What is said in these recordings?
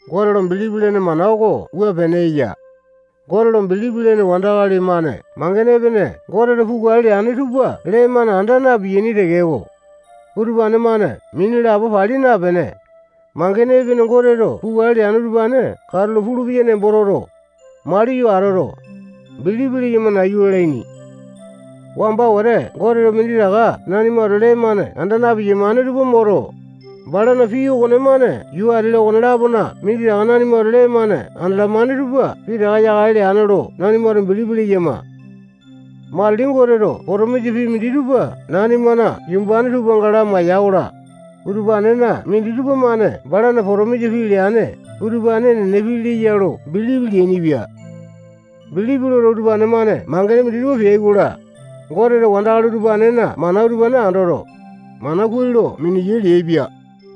Gote lo bilipi lene mana oko wua pene eya: Gote lo bilipi lene wandakali-mane mangene epene Goteto pukale leane tupa lee-mane anda na-piyaini tekeko, utupane-mane mini lapo pali napene, mangene epene Goteto pukale leane utupane katulo pulupeya nembo toto, maliyo atoto, bilipi leyama nayu lalaini. Wamba wete Goteto minditaka nanimato lee-mane anda na-piyamane tupa moto, balana pii okonemane yuu ati-la okone-lapona minditaka nanimato lee-mane andalamane tupa pitaka yakale leane lo nanimato bilipi leyama. Matili Goteto potomisa pii minditupa nanimana yumbane tupanga lamaiya-kola, utupanena minditupa-mane balana potomisa pii leane utupane enene pii leya lo bilipi leainipia. Bilipi loto, utupane-mane mangene minditupa peai-kola, Goteto wandakali utupanena mana utupane andoto, mana kuai lo miniyai leaipia.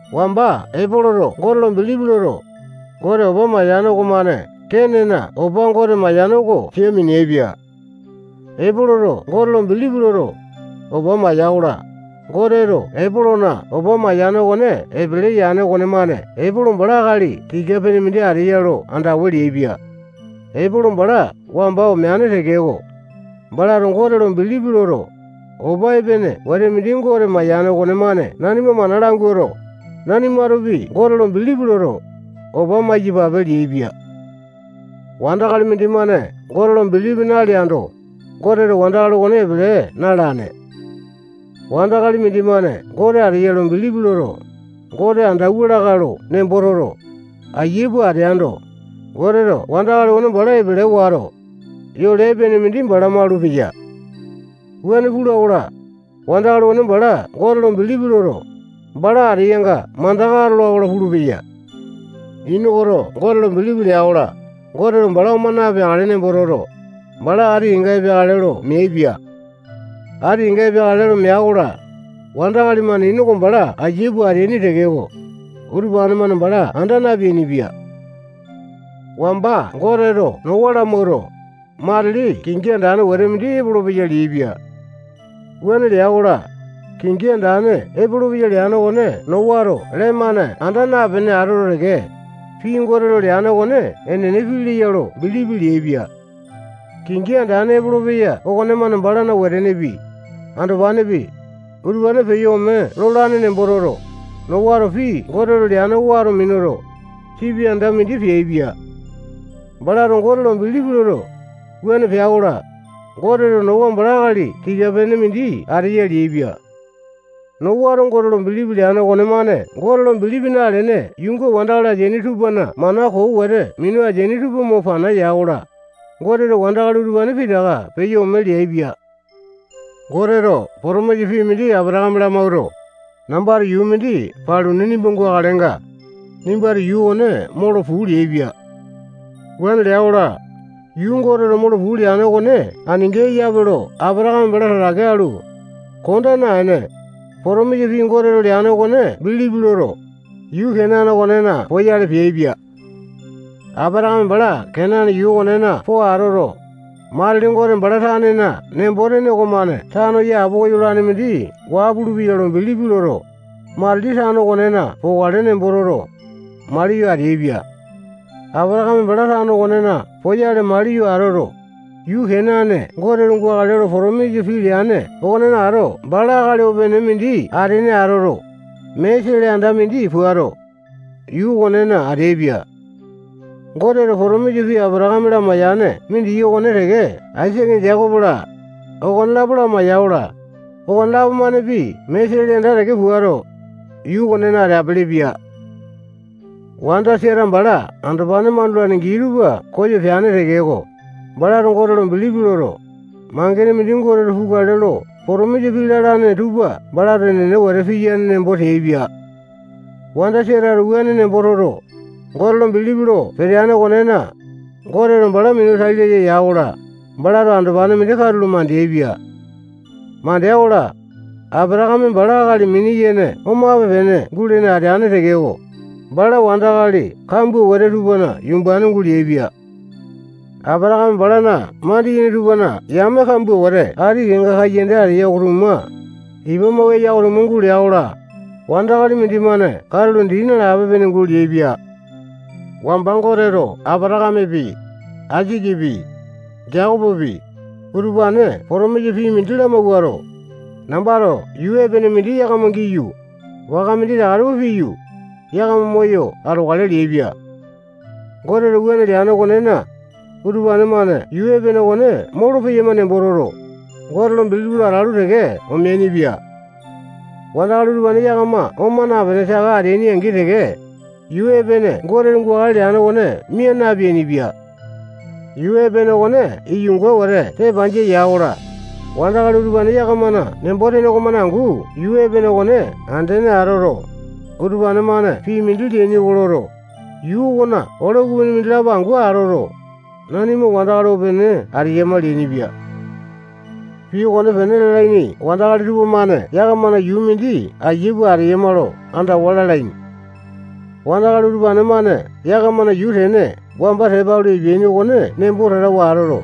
Wamba Epoloto Gote lo bilipi loto, Gote opa mayane okomane Kenena opa Gote mayane oko sia mineaipia. Epoloto Gote lo bilipi loto, opa maiya-kola, Goteto Epolona opa mayane okone epele yane okonemane Epolo bala akali tika-pene mindi ateya lo andawa leaipia. Epolo bala wamba omeane tekeko, balato Gote lo bilipi loto, opa epene wete mindi Gote mayane okonemane nanima mana languato, nanimatopi Gote lo bilipi loto, opa maiyapape leaipia. Wandakali mindimane Gote lo bilipi naleando, Goteto wandakali okone epele na-alane. Wandakali mindimane Gote ateya lo bilipi loto, Gote andawua lakae lo nembo toto, ayia pua ateando, Goteto wandakali okone bala epele wato, yole epene mindi bala maulupeya. Wuane pula-kola, wandakali okone bala Gote lo bilipi loto, bala ateyanga mandaka atola-kola pulupeya. Inokoto Gote lo bilipi lea-kola, Goteto bala oma napeakale nembo toto, bala ati kenga peakale lo meaipia. Ati kenga peakale lo mea-kola, wandakali-mane Inoko bala ayia pua ateaini tekeko, utupane-mane bala anda napeainipia. Wamba Goteto Nowa lamawuato, matili kingi andane wete mindi epolopeya leaipia. Wuane lea-kola, kingi andane epolopeya leane okone Nowato lee-mane anda napene atoto teke, pii Goteto leane okone enene pii leya lo bilipi leaipia. Kingi andane epolopeya okonemane balana wetenepi, andopanepi, utupane peyo ome lolane nembo toto, Nowato pii Goteto leane oko wato minuto, sipi anda mindi peaipia. Balato Gote lo bilipi loto, wuane pea-kola, Goteto Nowa bala akali tika-pene mindi ateya leaipia. Nowato gote lo bilipi leane okonemane Gote lo bilipi nalene yuunga wandakali tupana mana koo wete minu ateaini tupa mo pana ya-kola, Goteto wandakali utupane pitaka peyo ome leaipia. Goteto potomisa pii mindi Apatakame lamawuato, nambato yuu mindi paluni nimba gukalenga, nimbato yuu okone molo puu leaipia. Wuane lea-kola, yuu Goteto molo puu leane okone aninga eyape lo Apatakame bala tatake alu, konda naene, potomisa pii Goteto leane okone bilipi loto, yuu Kenane okonena poyale peaipia. Apatakame bala Kenane yuu okonena po atoto, matili Gote bala tanena nembo-tene okomane tano yapowa yolane mindi waa pulupeya lo bilipi loto, matili tano okonena pokale nembo toto, maliyo ateaipia. Apatakame bala tano okonena poyale maliyo atoto, yuu Kenane Goteto gukale lo potomisa pii leane okonena ato bala akali opene mindi atene atoto, mee sele anda mindi puato, yuu okonena ateaipia. Goteto potomisa pii Apatakame lamaiyane mindiki okone teke Aisake, Jekopo-la, okonelapo lamaiya-kola, okonelapo-manepi mee sele anda teke puato, yuu okonena ateapele-pia. Wanda Sata bala andopane mandulane gii tupa koyo peane tekeko, balato Gote lo bilipi loto, mangene mindi Goteto pukale lo potomisa pii lalane tupa balato enene wete piyane nembo teaipia. Wanda Satato wuane nembo toto, Gote lo bilipi lo peteane okonena, Goteto bala minu tai laya ya-kola, balato andopane mindi katulo mandeaipia. Mandea-kola, Apatakame bala akali mini-yene omape-pene gulene ateane tekeko, bala wandakali kambua wete tupana yumbane guleaipia. Apatakame balana mandiyene tupana yame kambua wete ati kenga kaiyanda ateya oko-tuma, ipa mau eya oko-tuma, guleai-kola, wandakali mindimane katulo dii nalape-pene guleaipia. Wamba Goteto Apatakamepi, Aisakepi, Jekopopi, utupane potomisa pii mindi lamawuato, nambato yuu epene mindi yakama giyu, waka minditaka tupa piyu, yakama moyo atokale leaipia. Goteto wuane leane okonena, utupane-mane yuu epene okone molopeyama nembo toto, Gote lo bilipi lo atalu teke omeainipia. Wandakali utupane yakama oma napene, saka ateai-angi teke, yuu epene Goteto gukale leane okone mia napeainipia. Yuu epene okone iyunga wete tepanjia ya-kola, wandakali utupane yakamana nembo-tene okomane angu yuu epene okone andene atoto, utupane-mane pii mindi leaini oko loto, yuu okona ole ukupini mindilapo angu atoto, nanima wandakali opene ateyama leainipia. Pii okonepene lalaini wandakali tupamane yakamana yuu mindi ayia pua ateyama lo andawa lalaini. Wandakali utupane-mane yakamana yuu tene wamba tepa alu epeaini okone nembo tatawa atoto,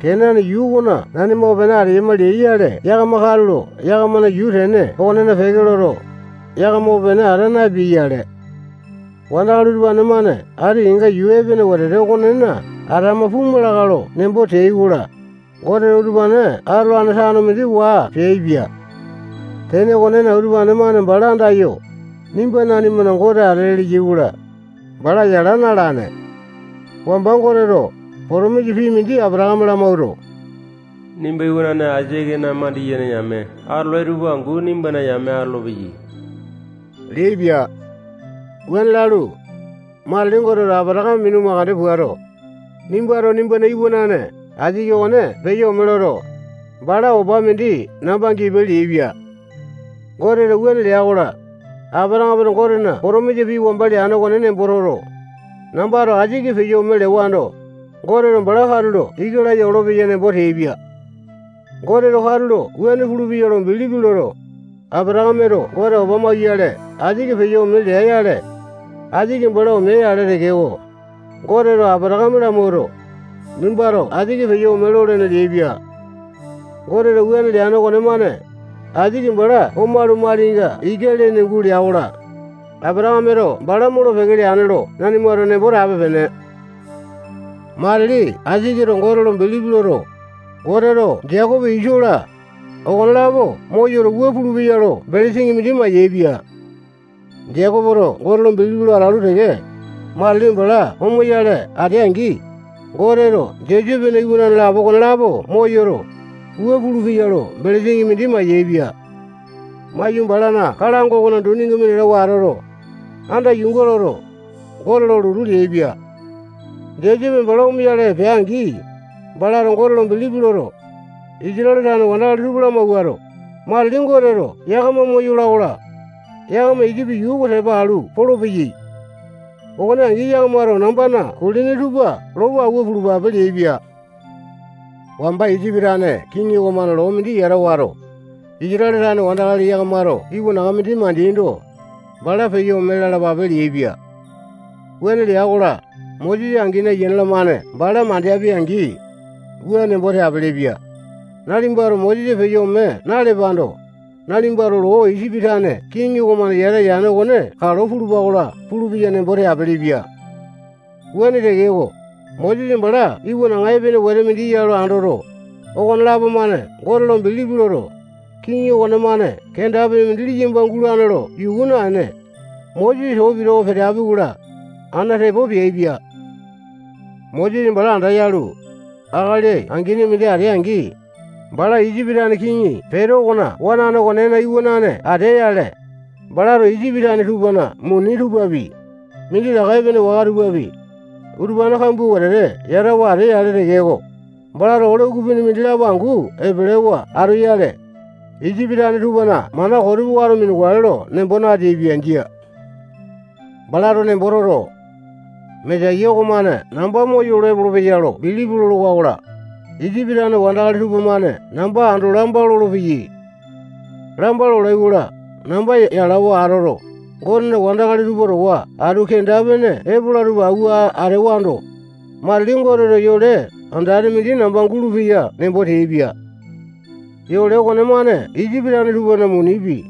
Kenane yuu okona nanima opene ateyama leai-yale, yakama katulo yakamana yuu tene okonena peke loto, yakama opene ata napeai-yale. Wandakali utupane-mane ati kenga yuu epene wetete okonena atama puma lakae lo nembo teai-kola, Goteto utupane atolane tano mindi waa peaipia. Tene okonena, utupane-mane bala andayo, nimba nanimana Gote atele leyai-kola, bala yala na-alane. Wamba Goteto potomisa pii mindi Apatakame lamawuato, nimba iwanane Aisakena mandiyene yame atolai tupa angu nimbana yame atolopeyai leaipia. Wuane lalu, matili Goteto Apatakame minu mandeke puato, nimbato nimbana iwanane Aisake okone peyo ome loto, bala opa mindi namba gipe leaipia. Goteto wuane lea-kola, Apatakameto Gotena potomisa pii wamba leane okone nembo toto, nambato Aisake peyo ome lewando, Goteto bala katulo ika laya olopeya nembo teaipia. Goteto katulo wuane pulupeya lo bilipi loto, Apatakameto Gote opa mauyale Aisake peyo ome lea-yale, Aisake bala omea-yale tekeko, Goteto Apatakame lamawuato, nimbato Aisake peyo ome lolene leaipia. Goteto wuane leane okonemane, Aisake bala omalu, malinga ika lene gulea-kola, Apatakameto bala molo-peke leane lo nanimato nembo tape-pene. Matili Aisaketo Gote lo bilipi loto, Goteto Jekopo, Iso-la, okonelapo moyoto, wua pulupeya lo belesini mindi mayaepia. Jekopoto Gote lo bilipi lo atalu teke, matili bala omoyale atea-angi, Goteto Josepena iwanane lapo okonelapo moyoto, wua pulupeya lo belesini mindi mayaepia. Maiyu, balana kalango okona duninga minatawa atoto, anda yuunga loto, Gote lo lotu leaipia. Josepe bala omoyale pea-angi, balato Gote bilipi loto, Isatale tane wandakali tupa lamawuato, matili Goteto yakama moyola-kola, yakama Isipi yuu oko tepa alu polopeyai. Okone angi, yakamato nambana kulini tupa lopo awua pulupape leaipia. Wamba Isipi tane kiŋi okomane loo mindi yata wato, Isatale tane wandakali yakamato iwanaŋa mindi mandeaindo, bala peyo ome lalapape leaipia. Wuane lea-kola, Mosesa angini, ayiane-lamane bala mandeapi-angi, wua nembo teapele-pia: Nalipato Mosesa peyo ome nalepando, nalipato loo Isipi tane kiŋi okomane yata yane okone kalo pulupa-kola pulupeya nembo teapele-pia. Wuane tekeko, Mosesa bala iwanaŋa epene wete mindi ya lo andoto, okonelapo-mane Gote lo bilipi loto, kiŋi okonemane kenda-pene mindi liyamba gulane lo yuku naene, Mosesa too pitawa peteapi-kola, ana tepo peaipia. Mosesa bala andayalu, akali angini mindi atea-angi, bala Isipi tane kiŋi Peto okona wanane okonena iwanane atea-yale, balato Isipi tane tupana muni tupapi, minditaka epene waka tupapi, utupane kambua wetete yatawa atea-yale. Wuane utupane yatawa atea-yale tekeko, balato ole ukupini mindilapo angu epelewa atoyale, Isipi tane tupana mana koo tupa wato minukale nembo nateaipia. Jia. Balato nembo toto, Mesaya okomane namba moyolo epolopeya lo bilipi lolowa-kola, Isipi tane wandakali tupamane namba ando lamba lolopeyai. Lamba lolai-kola, namba yalawa atoto, Gotena wandakali tupa towa atu kenda-pene epola tupa awua atewando, matili Goteto yole andane mindi namba gulupeya nembo teaipia. Yole okonemane Isipi tane tupana munipi,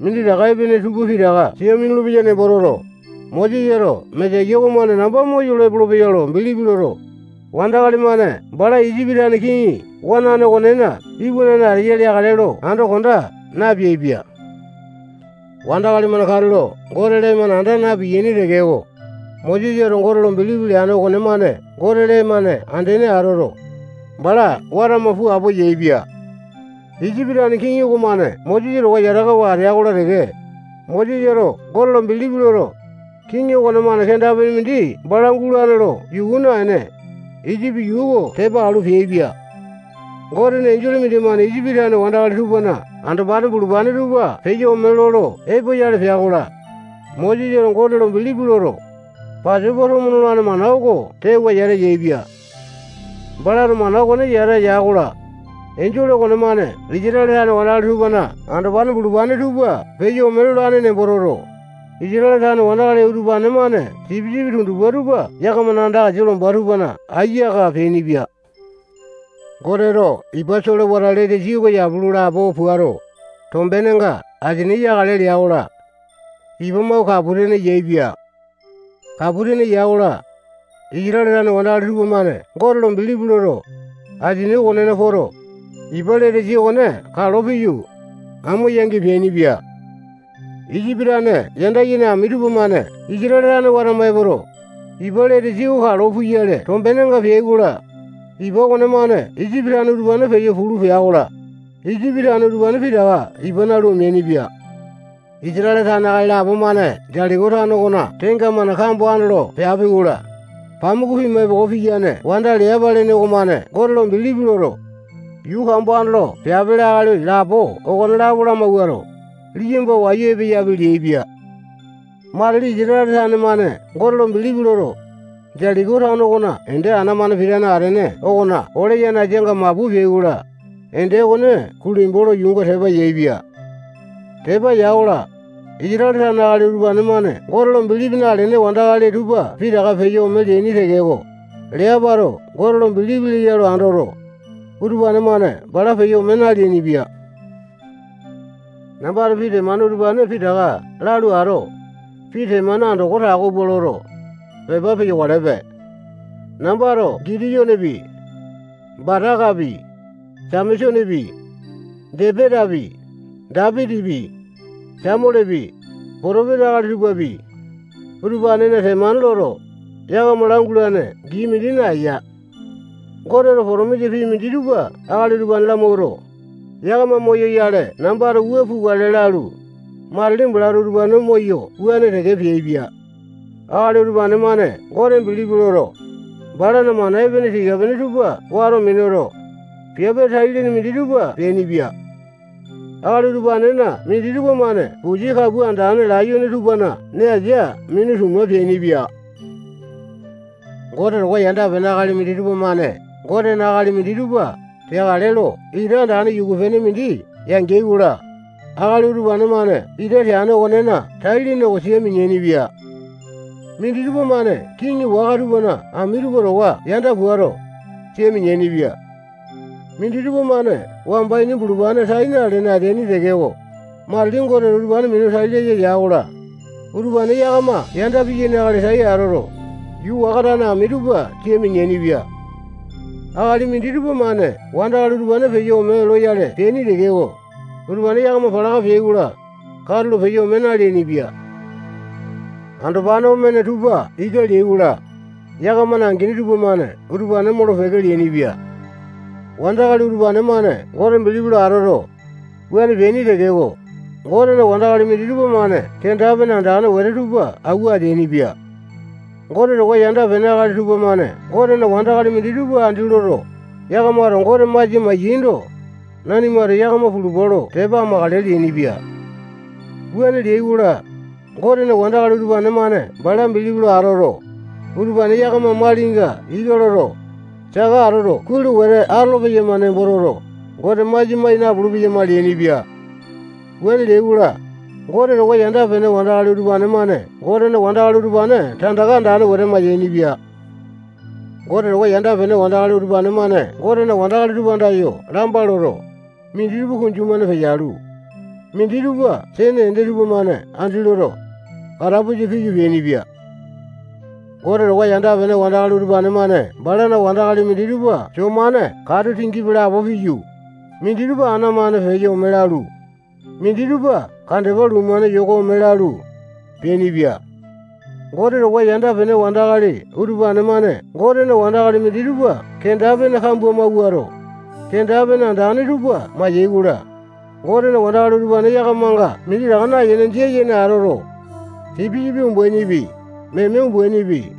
minditaka epene tupa pitaka sia minulu-peya nembo toto, Mosesato Mesaya oko namba moyolo epolopeya lo bilipi loto, wandakali-mane bala Isipi tane kiŋi wanane okonena iwanane ateya leakale lo ando konda napeaipia. Wandakali-mane katulo Gote lee-mane anda na-piyaini tekeko, Mosesato Gote lo bilipi leane okonemane Gote lee-mane andene atoto, bala watama pua apowa yaepia. Isipi tane kiŋi okomane Mosesa towa yatakawa atea-kola teke, Mosesato Gote lo bilipi loto, kiŋi okonemane kenda-pene mindi bala gulane lo yuku naene, Isipi yuu oko tepa alu, peaipia. Gotena enjole mindimane Isipi tane wandakali tupana andopane bulupane tupa peyo ome lolo epoyale pea-kola, Mosesato Gote lo bilipi loto, Pasopa tomo nolane mana oko tewa yata yaepia. Balato mana okone yata ya-kola, Enjole okomane Isatale tane wandakali tupana andopane bulupane tupa peyo ome lolane nembo toto, Isatale tane wandakali utupane-mane sipisipi tundupa tupa yakamana anda asia lomba tupana aiya aka peainipia. Goteto ipa solewata Letesi oko yapu lo lapo puato, tombenenga asini yakale lea-kola, ipa mau kapu tene yaepia. Kapu tene ya-kola, Isatale tane wandakali tupamane Gote lo bilipi loto, asini okonena poto, ipa Letesi okone kalo piyu, amo yaingi peainipia. Isipi tane yanda yene ami tupamane Isatale tane watama epoto, ipa Letesi oko kalo puyale tombenenga peai-kola, ipa okonemane Isipi yame utupane peyo pulu pea-kola, Isipi tane utupane pitaka ipa nalu, omeainipia. Isatale tane akali lapo-mane Jetiko tano okona tenga-mane kambo andolo peapi-kola, pamuku pima epoko piyane wanda Leapa lene okomane Gote lo bilipi loto, yuu kambo andolo peapele akali lapo okonelapo lamawuato, liyamba wayu epeyapi leaipia. Matili Isatale tane-mane Gote lo bilipi loto, Jetiko tano okona ende ana-mane pitane atene okona ole yanasanga mapu peai-kola, ende okone kulembu lo yuunga tepa yaepia. Tepa ya-kola, Isatale tane akali utupane-mane Gote lo bilipi nalene wandakali tupa pitaka peyo ome leaini tekeko, Leapato Gote lo bilipi leya lo andoto, utupane-mane bala peyo ome naleainipia. Nambato pii temane utupane pitaka lalu ato, pii temane andoko tako pua loto, pepa peyokalepe. Nambato Gitiyonepi, Batakapi, Samesonepi, Jepetapi, Dapitipi, Samualepi, potopesa akali tupapi, utupanena temane loto, yakama langulane gii mindi naeya. Goteto potomisa pii minditupa akali utupane lamawuato, yakama moyoyale nambato wua pukale lalu, matili balato utupane moyo wuane teke peaipia. Akali utupane-mane Gote bilipi loto, balana mana epene tika-pene tupa wato minuto, piape tai-lene minditupa peainipia. Akali utupanena minditupa-mane pusi kapua andane layone tupana nee asia minu tuma peainipia. Gote towa yanda-pene akali minditupa-mane Gotena akali minditupa teakale lo ita andane yuku-pene mindi yangeai-kola, akali utupa-mane ita teane okonena tai-lene oko sia mineaini-pia. Minditupa-mane kiŋi waka tupana ami tupa towa yanda puato, sia mineaini-pia. Minditupa-mane wamba ini bulupane tai nalene ateaini tekeko, matili Goteto utupane minu tai laya ya-kola, utupane yakama yanda piyaini akali tai atoto, yuu waka tane ami tupa sia mineaini-pia. Akali minditupa-mane wandakali utupane peyo ome loyale peaini tekeko, utupane yakama palaka peai-kola, katulo peyo ome naleainipia. Andopane omeaini tupa ika leai-kola, yakamana angini tupamane utupane molo-peke leainipia. Wandakali utupane-mane Gote bilipi lo atoto, wuane peaini tekeko, Gotena wandakali minditupa-mane kenda-pene andane wete tupa awua ateainipia. Gote towa yanda-pene akali tupamane Gotena wandakali minditupa andi loto, yakamato Gote masia mai-yaindo, nanimato yakama pulupa lo tepa amakale leainipia. Wuane leai-kola, Gotena wandakali utupane-mane bala bilipi lo atoto, utupane yakama malinga ika loto, saka atoto kuai lo wete atolo-peyama nembo toto, Gote masia mai napulu-peyama leainipia. Wuane leai-kola, Gote towa yanda-pene wandakali utupane-mane Gotena wandakali utupane tandaka andane wete mayainipia. Gote towa yanda-pene wandakali utupane-mane Gotena wandakali tupa andayo lamba loto, minditupa kunju-mane peyalu, minditupa sene ende tupamane andi loto, katapusa piyu, peainipia. Gote towa yanda-pene wandakali utupane-mane balana wandakali minditupa soo-mane katu tingipi lapo piyu, minditupa ana-mane peyo ome lalu, minditupa kandepa luu-mane yoko ome lalu, peainipia. Gote towa yanda-pene wandakali utupane-mane Gotena wandakali minditupa kenda-pene kambua mawuato, kenda-pene andane tupa mai-yaikola, Gotena wandakali utupane yakamanga minditaka nayene, jia yene atoto, sipisipi umbainipi, meme umbainipi,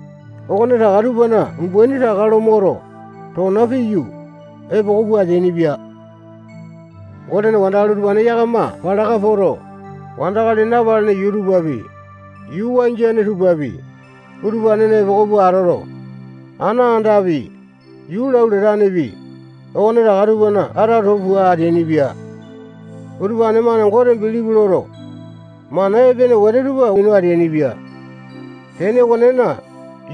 okonetaka tupana umbaini taka lo moto, tona piyu, epoko pua ateainipia. Gotena wandakali utupane yakama palaka poto, wandakali napalene yuu tupapi, yuu wangiane tupapi, utupanena epoko pua atoto, ana andapi, yuu lau latanepi, okonetaka tupana ata too pua ateainipia. Utupane-mane Gote bilipi loto, mana epene wete tupa minu ateainipia. Tene okonena,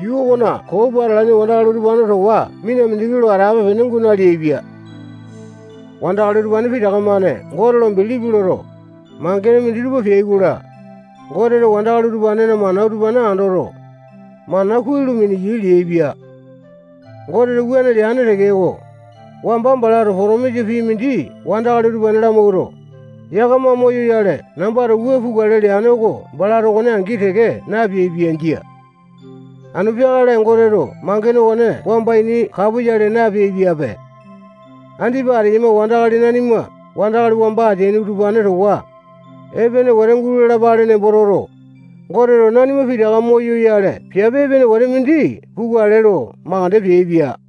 yuu okona koo pua atalaini wandakali utupane towa mina mindiki lo atape-pene guu naleaipia. Wandakali utupane pitaka-mane Gote lo bilipi loto, mangene minditupa peai-kola, Goteto wandakali utupanena mana utupane andoto, mana kuai lo miniyai leaipia. Goteto wuane leane tekeko, wamba balato potomisa pii mindi wandakali utupane lamawuato, yakama moyoyale nambato wua pukale leane oko balato okone angi teke napeaipia. Jia. Anu peakale Goteto mangene okone wamba ini kapoyale napeai-piape. Andipa ateyama wandakali nanima wandakali wamba ateaini utupane towa epene wete gulalapale nembo toto, Goteto nanima pitaka moyoyale piape epene wete mindi pukale lo mandeke peaipia.